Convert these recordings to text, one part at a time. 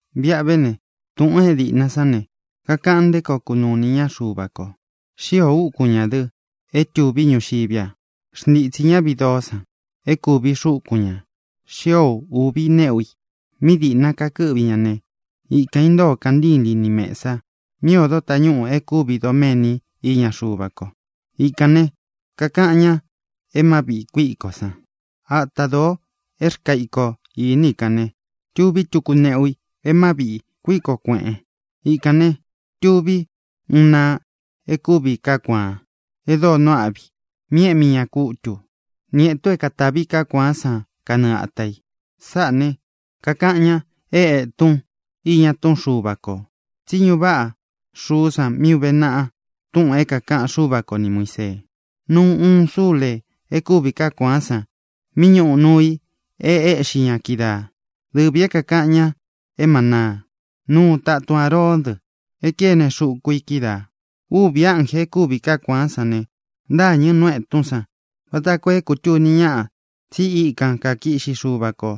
Viꞌa vé ne, túꞌūn é dīꞌna sán ne, kakaꞌan nté koo kunuu inī ñá Xuva kō. Xíō úkun ñā dɨ é tuví ñuxiví a. Xntitsī ñá viꞌi doó san é kūvi xúkun ñā. Xío ūvi neꞌu i. Míꞌi dīꞌna kakɨ́ꞌvi ña ne, ikān intóo kantílīn ní mesa mí ōdo tañúꞌū é kūvi doméni iña Xuva ko. Ikān ne, kakaꞌan ña é Má Viꞌī Kuíkó san. Áta dōo é rkaa iko īní i kān ne, tuví tuku neꞌu i mí kakāꞌan ña é Má Viꞌī Kuíkō Kueꞌen. Ikān ne, tuví uun naa e kúvi kaá kuāan e dóo nuu áꞌvi i mí eꞌmi ña kútū, ni ētun é kātavi kaá kuaán san kanɨɨ āta i. Sáꞌā ne, kakaꞌan ña é Ētun Iña Túꞌun Xuva Kō, tsí ñuꞌu váꞌa xuú san mí ūve naꞌa túꞌūn é kākaꞌan Xúva ko ni Muīsee. Nuu uun súlē e kúvi kaá kuaán san mí ñūꞌu nuu i e éꞌxi ña kídaa, dɨvī é kākaꞌan ña é manaa. Nuu tatun Āroón dɨ é kéne xuku i kídaā. Úvī ánjē e kúvi kaá kuaán san ne, ntâñɨ nú etún san vata koo é kūtuni ñáꞌa tsi íkan kakiꞌxi Xuva kō,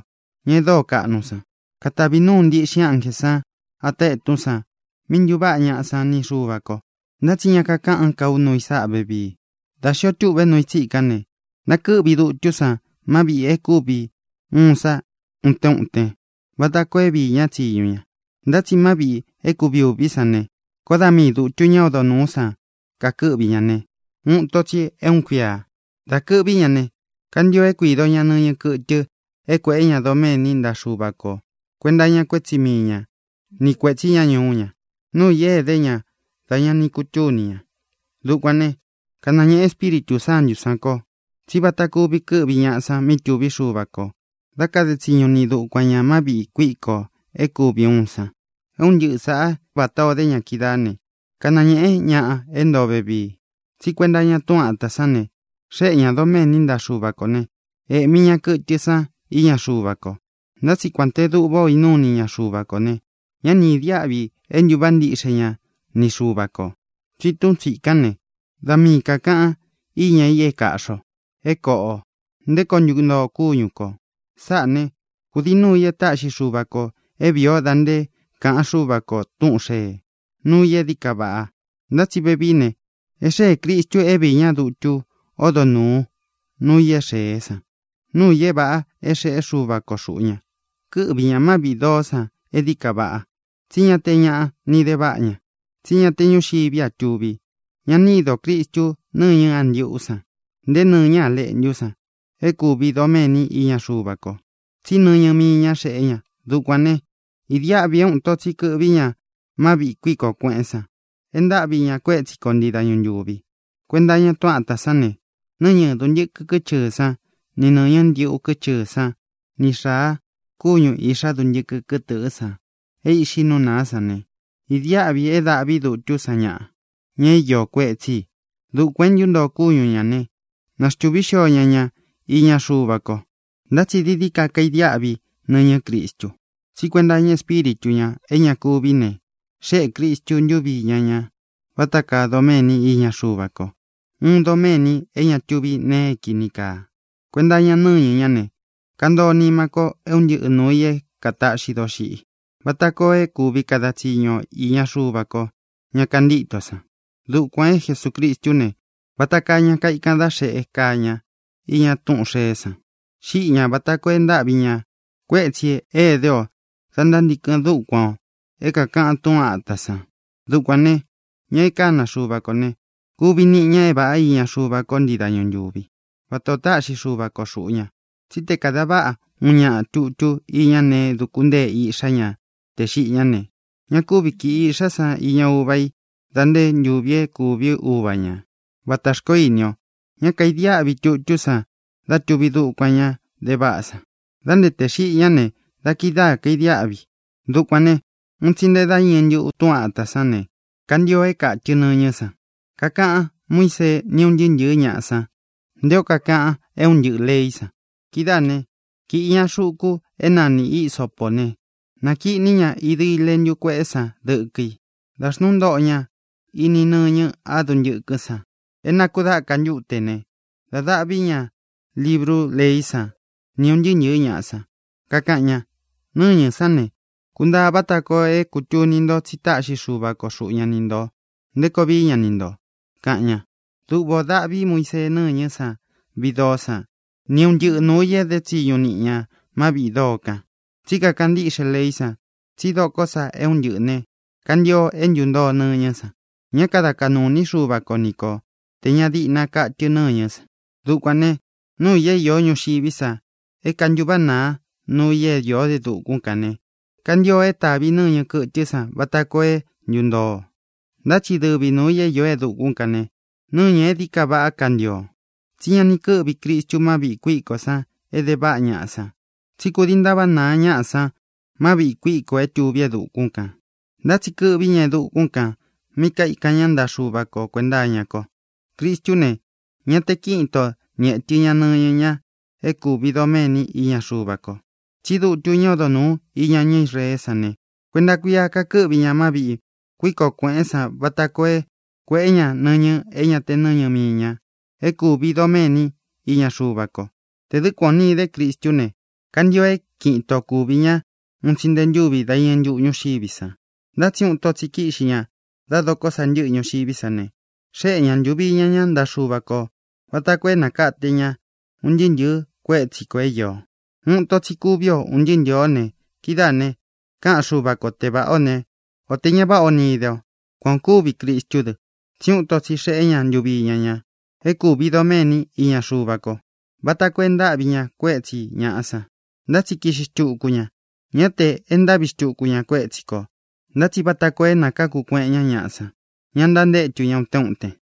ña dóo kaꞌnu san. Katavi núu ntiꞌxin ánjē san ata etún san mí ntuváꞌa ñaꞌa san ni Xuva kō. Ntá tsi ña káꞌán ka u nuu i sáꞌa vevii. Dā xío tuꞌve nuu i tsíkān ne, ntakɨ́ꞌvi dutú san má viꞌī é kuvi ūun san utén utén vata koo é viī ñá tsiñu ña. Ntá tsi má viꞌī é kuvi ūví san ne, koó da miī dutu ñá odo nūú san kakɨꞌví ña ne, uun ito tsi é uun kuia. Dá kɨ̄ꞌví ña ne, kantio é kuīdo ña nɨñɨ kɨtɨ é kuēꞌé ña doméni ntaꞌa Xuva ko kuēnta iña kuétsi mii ña ni kuētsí ña ñuú ña, nuu i é idé ña dá ña ni kutúni ña. Dukuān né, kanañēꞌe Espíritū Sántū sán kō tsí vata kúvi kɨ́ꞌvi ñaꞌa san mí tuví Xuva kō dá kade tsiñu niꞌi dukuan ñā má viꞌī kuíko é kuvi ūun san. É un ntɨꞌɨ sāꞌá vatā o dé ña kídaā né, kanañēꞌe ñaꞌa é ntoo vevii. Tsí kuenta iña túꞌun āta sán ne, xéꞌe ñā doméni ntaꞌa Xuva kō né, ēꞌmi ña kɨtɨ san iña Xuva ko. Ntá tsi kuān té duꞌvā ó inúu ini ña Xuva kō ne, ñá ni idiáꞌvi e ntuváꞌa ntiꞌxe nima ñá ni Xuva kō. Tsi túꞌun tsīkán ne, da mii kākaꞌan íña i é kāꞌxi o, é koꞌo ō, nté koo ntuntoo kúñu kō. Sáꞌā ne, kudii núu ī e táꞌxi Xuva kō é vīi ó da nté kāꞌan Xúva kō túꞌūn xee, nuu i e dií ka vaꞌa. Ntá tsi vevií ne, e xée Cristu é viī ñá dutu ódo nūu nuu i é xēé san, nuu i é vāꞌa é xeꞌé Xuva ko xūꞌu ña. Kɨ́ꞌvi ñā má viꞌī doó san e dií kaa vaꞌa, tsí ña te ñaꞌa ni de váꞌa ña, tsí ña te ñúxiví a tuvi. Ña ni ídō Cristu nɨñɨ́ a ndiꞌú san, nté nɨ̄ñɨ́ a leꞌntú san é kūvi doméni iña Xuva ko, tsí nɨñɨ mii ñá xeꞌé ña. Dukuān ne, idiáꞌvi é uun ito tsi kɨ̄ꞌví ña má viꞌī kuíkō kueꞌén san e ntáꞌvi ñā kuétsi ko ntii dañu ntūvi. Kuenta iña túꞌun āta sán ne, nɨ́ñɨ dūntɨkɨ kɨ́chɨɨ̄ sán ni nɨ̄ñɨ́ ndiꞌu kɨ́chɨɨ̄ sán ni xāa kúñū iꞌxá duntɨkɨ kɨ́tdɨ̄ꞌɨ́ san é īꞌxi nú nāá san ne, idiáꞌvī é dāꞌví dutú san ñaꞌa, ña é iō kuetsí i. Dukuān é ntuntoo kúñu ñā ne, naxtuvī xío ña ña iña Xuva ko. Ntá tsi dií dií ka kaidiáꞌvi nɨñɨ́ Cristu. Tsí kuenta iña Espíritu ñā é ña kuví ne, xeꞌé Cristu ntuvi íña ña vata kaa doméni iña Xuva ko, uun doméni é ña tuvi nee é kīni kaa. Kuenta iña nɨ́ñɨ ñá ne, kantoo nimá kō é un ntɨꞌɨ nūu i é kātaꞌxi doxiꞌi, vata koo é kuvi kada tsiñu o īña Xuva ko, ña kantíto san. Dukuān é Jesucristú ne, vata kaa ña kaikan dá xeꞌe kaa ña iña túꞌūn xeé san. Xíꞌi ñā vata koo e ntáꞌvi ñā kuétsī é idé ō da ntántīkɨn dúkuan ō é kākaꞌan túꞌun āta san. Dukuān ne, ña e kána Xuva kō ne, kuvi niꞌi ña é vāꞌá iña Xuva ko ntii dañu ntúvi, vatā o táꞌxi Xuva ko xūꞌu ña. Tsí te kāda váꞌa uun ñaꞌa tutú iña nee é dūku ntée iꞌxá ña te xiꞌi ñá ne, ña kúvi kīꞌi iꞌxá san iña uva i dā nté ntūvi é kūví uva ña, vatā xkoó ini o. Ña kaidiáꞌvi tutú san dá tūvi dukuan ñá de váꞌa san. Dā nté tē xiꞌi ñá ne, da kidáā kaidiáꞌvi i. Dukuān ne, un tsi nte dá iñɨ ntuꞌu túꞌun āta sán ne, kantio é kātɨ nɨñɨ́ san. Kakaꞌan Muísee ni ún ntɨɨ́ ntɨ̄ɨ́ ñaꞌa san nté o kakaꞌan é un ntɨꞌɨ lēí san. Kidáā né, kīꞌi ña xuku é nani hīsopó ne, nākiꞌní ña idi leꞌntu kuéꞌé san dɨkɨ i. Dā xnúu ntoꞌo ña ini nɨñɨ a dúntɨkɨ́ san é nākudáka ntúte ne, da dáꞌvi ñā librú leí san ni ūn ntɨɨ́ ntɨ̄ɨ́ ñaꞌa san. Kakaꞌan ña: “Nɨ́ñɨ̄ sán ne, kuntāꞌa vata koo é kūtuni nto tsi táꞌxi Xuva ko xuꞌu ña ni ntō nté koo vií ña ni ntō”, kaꞌan ña. Duꞌva ō daꞌví Muisee nɨ̂ñɨ́ san viꞌi doó san ni un ntɨꞌɨ nūu i é de tsiñu niꞌi ñā má viꞌī doo kan. Tsí kakaꞌan ntíꞌxe leí san tsí dokó sa é un ntɨꞌɨ̄ ne, kantio é ntuntoo ni nɨ̄ñɨ́ san. Ñá kada kaꞌnū iní Xuva ko ni ko tē ña diꞌna katɨ nɨ̂ñɨ́ san. Dukuān ne, núu ī é īó ñuxiví sa é kāntuváꞌa naa nuu i é īó e dukún kān ne, kantio é tāvi nɨ́ñɨ kɨtɨ́ san vata koo é ntūntoo. Ntá tsi dɨvi nuū i é īó e dukún kān ne, nɨ́ñɨ̄ é dií ka vaꞌá kantio. Tsi ñá ni kɨ̄ꞌví Cristu má viꞌī kuíkó san é de váꞌa ñaꞌa san, tsí kudii e ntáváꞌa nāá ñaꞌa san má viꞌī kuíko é tuví e dukún kān. Ntá tsi kɨꞌví ña e dukún kān mí kaikan ñá ntaꞌa Xuva ko kuēnta iña ko. Cristú ne, ña te kíꞌin ito ni ētɨ ña nɨñɨ ña é kūvi doméni iña Xuva ko. Tsí dutu ñá odo nūú iña ñá Israeé san ne, kuenta kuia kakɨ́ꞌvi ña má viꞌī kuíkō kueꞌén san vata koo é kuēꞌé ña nɨñɨ é ña te nɨ́ñɨ mii ña é kūvi doméni iña Xuva ko. Tē dɨ́ kuan ō ni idé Cristú ne, kantio é kiꞌin ito kuvī ñá un tsi nte ntúvi dá iñɨ ntuꞌu ñúxiví san. Ntá tsi uun ito tsi kíꞌxi ña da dokó sa ntɨ́ꞌɨ ñuxiví san ne, xéꞌe ña ntūvi iña ña ntaꞌa Xúva kō vata koo é nakate ña un ntɨɨ́ ntɨ̄ɨ́ kuétsi kō é īo. Uun ito tsi kuví o, ūn ntɨɨ́ ntɨ̄ɨ o ne, kidáā ne, káꞌan Xuva ko te vāꞌá ō ne, o tē ña váꞌa ō ni ide o. Kuan ō kúvi Cristú dɨ, tsí uun ito tsi xeꞌé ña ntuvi iña ña é kūvi doméni iña Xuva ko, vata koo e ntáꞌvi ña kuétsī ñaꞌa san. Ntá tsi kiꞌxi xtuku ña, ñá tē e ntáꞌvi xtuku ña kuétsi kō, ntá tsi vata koo é nakākú kueꞌen ñá ñaꞌa san, ña ntantétu ña utén uten.